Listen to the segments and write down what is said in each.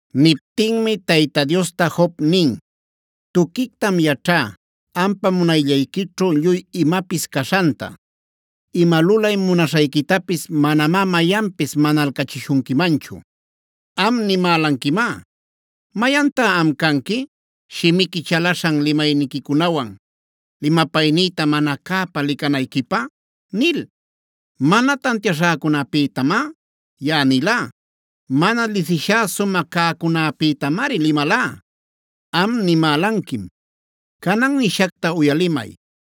Niptinmi Tayta Diosta Job nin: “Tuquictam yaćhá ampa munayllayquićhu lluy imapis caśhanta; ima lulay munaśhayquitapis manamá mayanpis manalcachishunquimanchu. Am nimälanquimá: ‘¿Mayantá am canqui shimiqui chalaśhan limayniquicunawan limapaynïta mana cäpa licanayquipä?’ nil.a Mana tantiaśhäcunapïtamá yaꞌa nilá; mana lisishá sumä cäcunäpïtamari limalá. Am nimälanquim: ‘Canan nishacta uyalimay;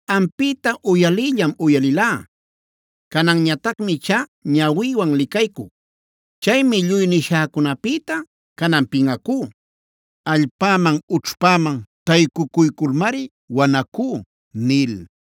Ampïta uyaliyllam uyalilá; cananñatacmi ichá ñawïwan licaycuc. Chaymi lluy nishäcunapïta canan pinꞌacú; allpäman ućhpäman taycucuyculmari wanacú” nil.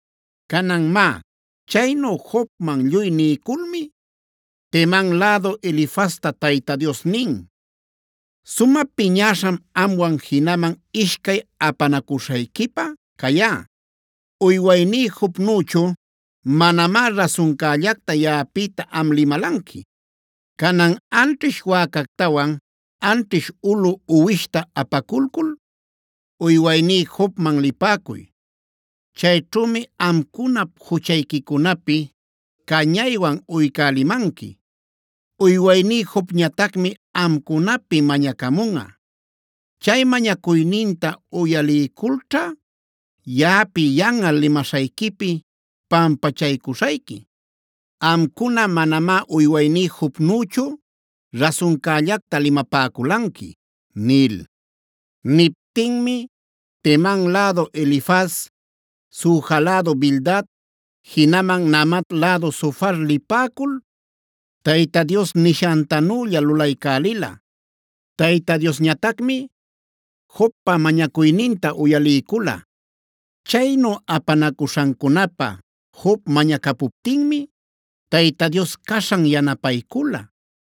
Canan má, chaynu Jobman lluy niyculmi Teman lädu Elifazta Tayta Dios nin: “Sumä piñäśham amwan jinaman ishcay apanacuśhayquipä cayá. Uywayní Jobnüchu manamá rasuncällacta yaꞌapïta am limalanqui. “Canan anćhish wäcactawan anćhish ulu uwishta apaculcul uywayní Jobman lipäcuy. Chayćhümi amcunap juchayquicunapi cañaywan uycälimanqui.c Uywayní Jobñatacmi amcunapi mañacamunꞌa. Chay mañacuyninta uyaliyculćha yaꞌapi yanꞌal limaśhayquipi pampachaycuśhayqui. Amcuna manamá uywayní Jobnüchu rasuncällacta limapäculanqui” nil. Niptinmi Teman lädu Elifaz, Suja lädu Bildad, jinaman Naamat lädu Zofar lipäcul Tayta Dios nishantanülla lulaycälila. Tayta Diosñatacmi Jobpa mañacuyninta uyaliycula. Chaynu apanacuśhancunapä Job mañacapuptinmi Tayta Dios caśhan yanapaycula.d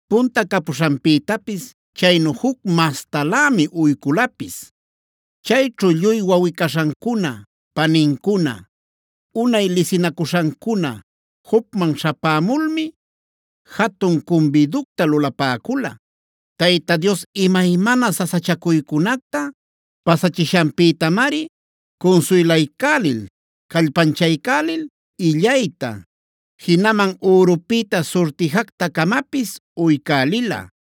Punta capuśhanpïtapis chaynu juc mastalämi uyculapis. Chayćhu lluy wawꞌi-caśhancuna, panincuna, unay lisinacuśhancuna Jobman śhapämulmi jatun cumbiducta lulapäcula. Tayta Dios imaymana sasachacuycunacta pasachishanpïtamari cunsuylaycälil, callpanchaycälil illayta, jinaman ürupïta surtijacta-camapis uycälila.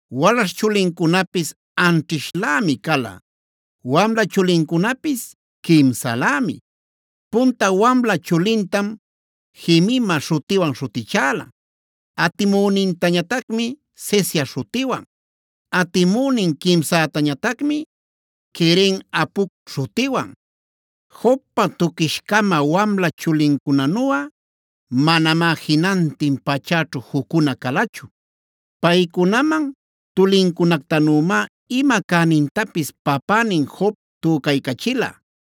Walaśh chulincunapis anćhishlämi cala, wamla chulincunapis quimsalämi. Punta wamla chulintam Jemimae śhutiwan śhutichäla; atimünintañatacmi Cesiaf śhutiwan, atimünin quimsätañatacmi Keren-hapucg śhutiwan. Jobpa tuquish-cama wamla chulincunanuꞌa manamá jinantin pachäćhu juccuna calachu. Paycunaman tulincunactanümá ima cänintapis papänin Job tücaycachila.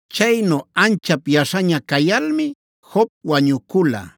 Chaynu anchap yaśhaña cayalmi Job wañucula.